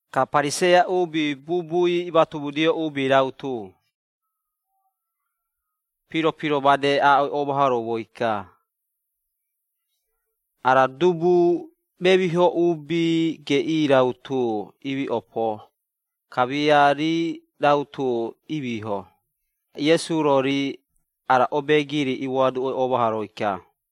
Ka Pariseia uubi, bubui imatomudio uubi rautu, piro-piro made aaꞌoi oomahoroumoi-ka, “Ara dubu, memiho uubi geꞌii rautu imiꞌopo, kamia rii rautu imiiho!” Ka Iesu-ro rii ara obeegiri imoaduꞌoi oomahoroi-ka.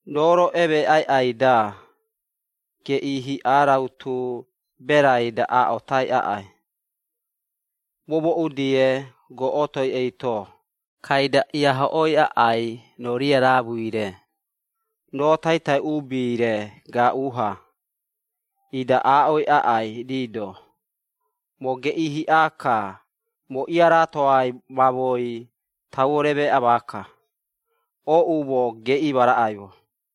Roo-ro emeeꞌai aꞌai-da, geꞌii hiꞌa rautu, berai-da aaꞌotai aꞌai, momooꞌu-die goꞌotoi eito, kaida iahoꞌoi aꞌai roo riaraamui-re, roo taitai uubi-re gaaꞌu-ha, ida aaꞌoi aꞌai rii-do, ‘Moo geꞌii hiꞌa-ka, moo iaraatoai mamoei tauo remeeꞌa maaka. Ooꞌumo geꞌii ma raꞌaimo!’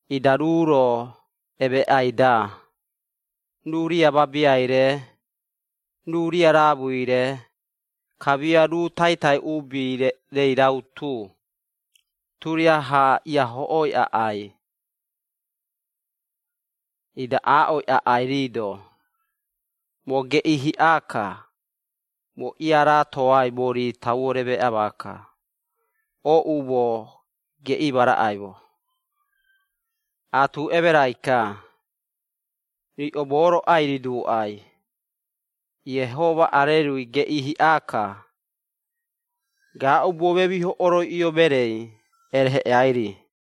Ida ruu-ro emeeꞌai-da, ruu riamabiai-re, ruu riaraamui-re, kamia ruu taitai uubi-rei rautu, turiaha iahoꞌooi aꞌai gaaꞌu-ha, ida aaꞌoi aꞌai rii-do, ‘Moo geꞌii hiꞌai-ka, moo iaraatoai mori tauo remeeꞌa maaka. Ooꞌumo, geꞌii ma raꞌaimo!’ Aatu emerai-ka, riꞌo moo-ro ai-riduuꞌai, Iehoma arerui geꞌii hiꞌa-ka, gaaꞌubuo memiho oroiꞌio mereei ereheꞌeai-ri.”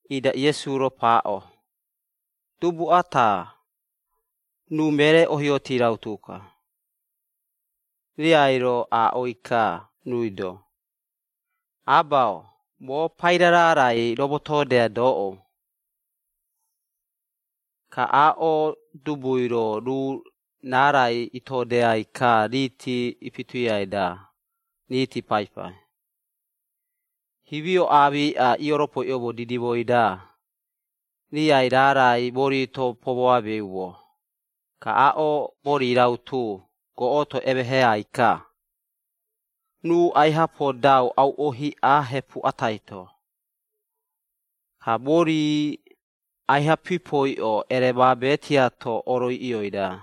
Ida, Iesu-ro paaꞌo, “Dubu ata, ruu meree ohioti rautu-ka. Riai-ro aaꞌoi-ka ruui-do, ‘Aba-o, moo paira raarai romotoodeai doꞌou.’ Ka aaꞌo dubui-ro, ruu raarai itoodeai-ka riiti ipituiai-da, riiti paipai. Himio aamiꞌa, ioropoiꞌoumo didimoi-da, riai raarai mori-to pomoaameumo, ka aaꞌo mori rautu, goꞌotoi emeheꞌai-ka. Ruu aiha podau auꞌo hiꞌa hepu atai-to, ka mori aiha pipoiꞌo, ereemaabe tiato oroiꞌioi-da.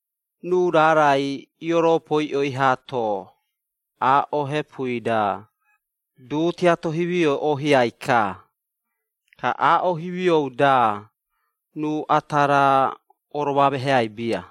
Ruu raarai ioropoiꞌoi haato, aaꞌo hepui-da, du tiato himioi oohiai-ka, ka aaꞌo himiou-da ruu ata raa oromoameheai bia.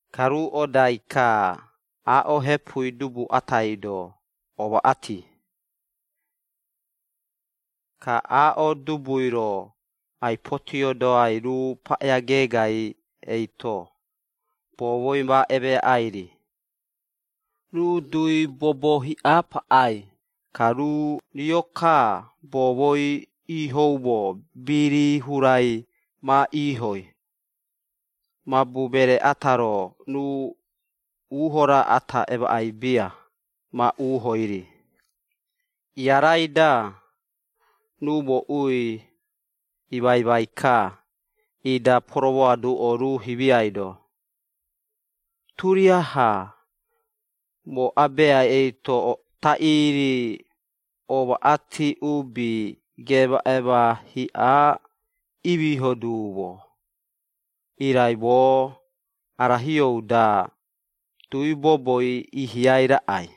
Ka ruu odai-ka, aaꞌo hepui dubu atai-do, omaꞌati. Ka aaꞌo dubui-ro, ai-potiodoai ruu paꞌea geegai eito, boomoi ma emeaꞌai-ri. Ruu dui bobo hiꞌa paꞌai, ka ruu rio-ka boomoi iihoumo birii hurai ma iihoi. Mabu meree ata-ro, ruu uuho raa ata emaꞌai bia, ma uuhoi-ri. Iarai-da, ruu mooꞌui imaimai-ka, ida poromoaduꞌo ruu himiai-do, ‘Turiaha moo abeai eito taꞌii-ri omaꞌati uubi, geemaꞌeema hiꞌai imiiho duumo, irai moo ara hiou-da, dui boboi iihiai raꞌai!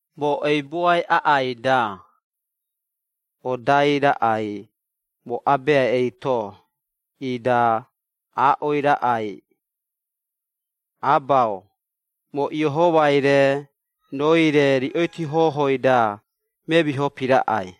Moo eibuai aꞌai-da, odai raꞌai, moo Abeai eito, ida aaꞌoi raꞌai, “Aba-o, moo Iehomai-re, rooi-re, riꞌoiti hohoi-da, memiho piraꞌai.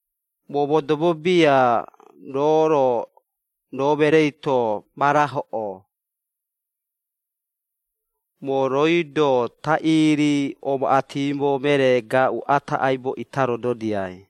Moo modobo bia roo-ro, roo mereei-to ma rahoꞌo, moo rooi-do taꞌii-ri omaꞌatimo meree gaaꞌu ata, aibo ita rododiai!”’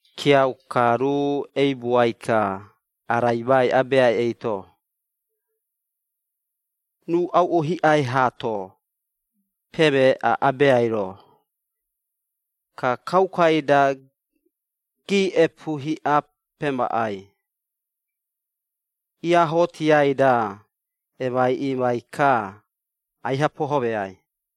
Kiauka, ruu eibuai-ka, araimai abeai eito. “Ruu auꞌo hiꞌai haato, pemeeꞌa abeai-ro, ka kaukai-da giiꞌepu hiꞌa pemaꞌai, iaahootiai-da emaiꞌiimai-ka, aiha pohomeai.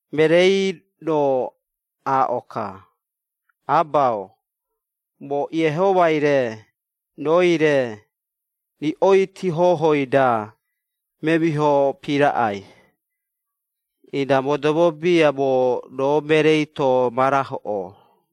“Mereei-ro aaꞌo-ka, ‘Aba-o, moo Iehomai-re, rooi-re, riꞌoiti hohoi-da memiho piraꞌai, ida modobo bia moo, roo mereei-to ma rahoꞌoo.’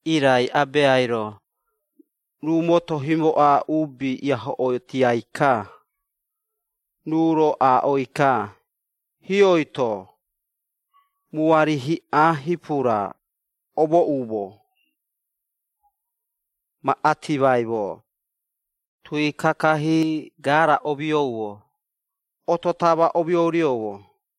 Irai abeai-ro, ruu moto himoꞌa uubi iahoꞌootiai-ka, ruu-ro aaꞌoi-ka, ‘Hioi-to, muari hiꞌa hipura, omomooꞌumo, ma atimaimo, tui kakahii garaa omioumo, oto tama omiourioumo.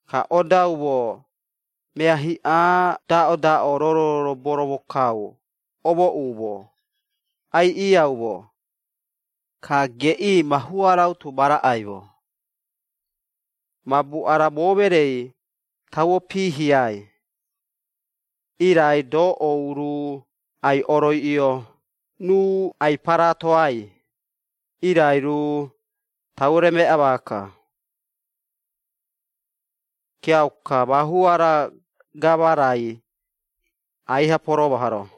Ka odaumo, mea hiꞌa daꞌodaꞌo, roro boromokau, omooꞌumo, aiꞌiiaumo, ka geꞌii, mahua rautu ma raꞌaimo! Mabu, ara moo mereei, tauo piihiai, irai doꞌou ruu ai-oroiꞌio, ruu ai-paraatoai, irai ruu tauo remeeꞌa maaka.’ Kiauka, mahua-ra gama-rai aiha poromahoro.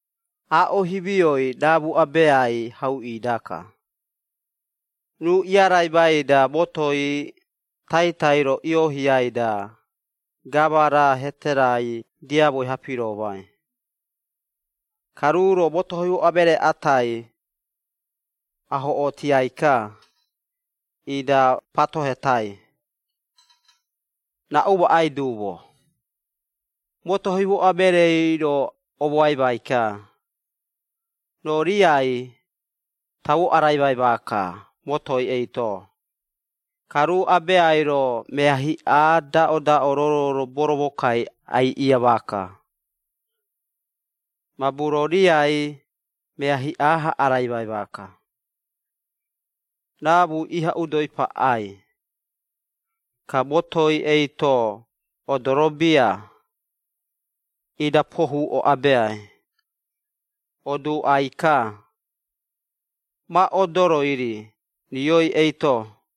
“Aaꞌo himioi, raamu-abeai hauꞌii-daka. Ruu iaraimai-da, motoi taitai-ro ioohiai-da, gama-ra hete-rai diamoi-ha, piroomai. Ka ruu-ro, moto himoꞌa meree atai, ahoꞌotiai-ka, ida, patohetai, ‘Raꞌu maꞌai duumo?’ Moto himoꞌa mereei-ro omoaimai-ka, ‘Roo riai, tauo araimai maaka motoi eito, ka roo abeai-ro, mea hiꞌa daꞌodaꞌo, roro boromokau aiꞌiia maaka, mabu roo riai mea hiꞌa-ha araimai maaka.’ “Raamui iha udoi paꞌai, ka motoi eito odoro bia, ida pohuuꞌo abeai, oduuꞌai-ka, ma odoroi-ri rioi eito.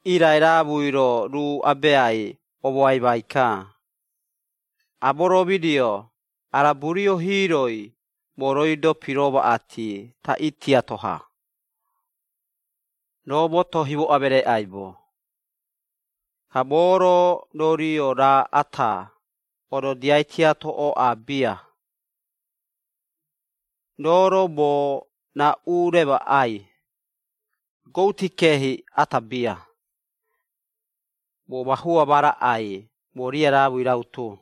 Irai raamui-ro, ruu abeai omoaimai-ka, ‘Amoromidio, ara burio hiiroi, moo rooi-do piromaꞌati, taꞌii tiato-ha, roo moto himoꞌa meree aibo. Ka moo-ro, roo rio raa ata, ododiai tiato ooꞌa bia. Roo-ro, moo raꞌu remaꞌai? Gouti keehi ata bia, moo mahua ma raꞌai, moo riaraamui rautu.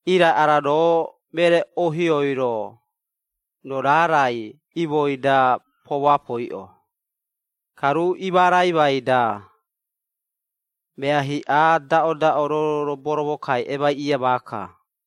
Irai, ara roo meree ohioi-ro, roo raarai imoi-da pomoapoiꞌo. Ka ruu imaraimai-da, mea hiꞌa daꞌodaꞌo, roro boromokau, emaiꞌiia maaka!’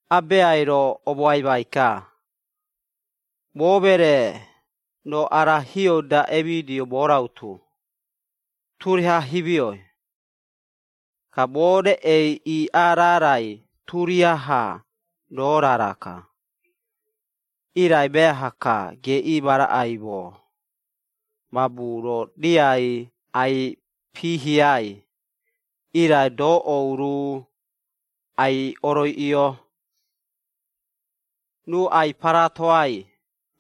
Abeai-ro omoaimai-ka, ‘Moo meree, roo ara hiou-da emidio, moo rautu, turiaha himioi. Ka moo reꞌei iiꞌaa raarai, turiaha roo raara-ka! Irai meaha-ka, geꞌii ma raꞌaimo, mabu roo riai ai-piihiai, irai doꞌou ruu ai-oroiꞌio, ruu ai-paraatoai,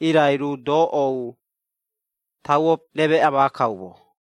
irai ruu doꞌou tauo remeeꞌa maakaumo!.’”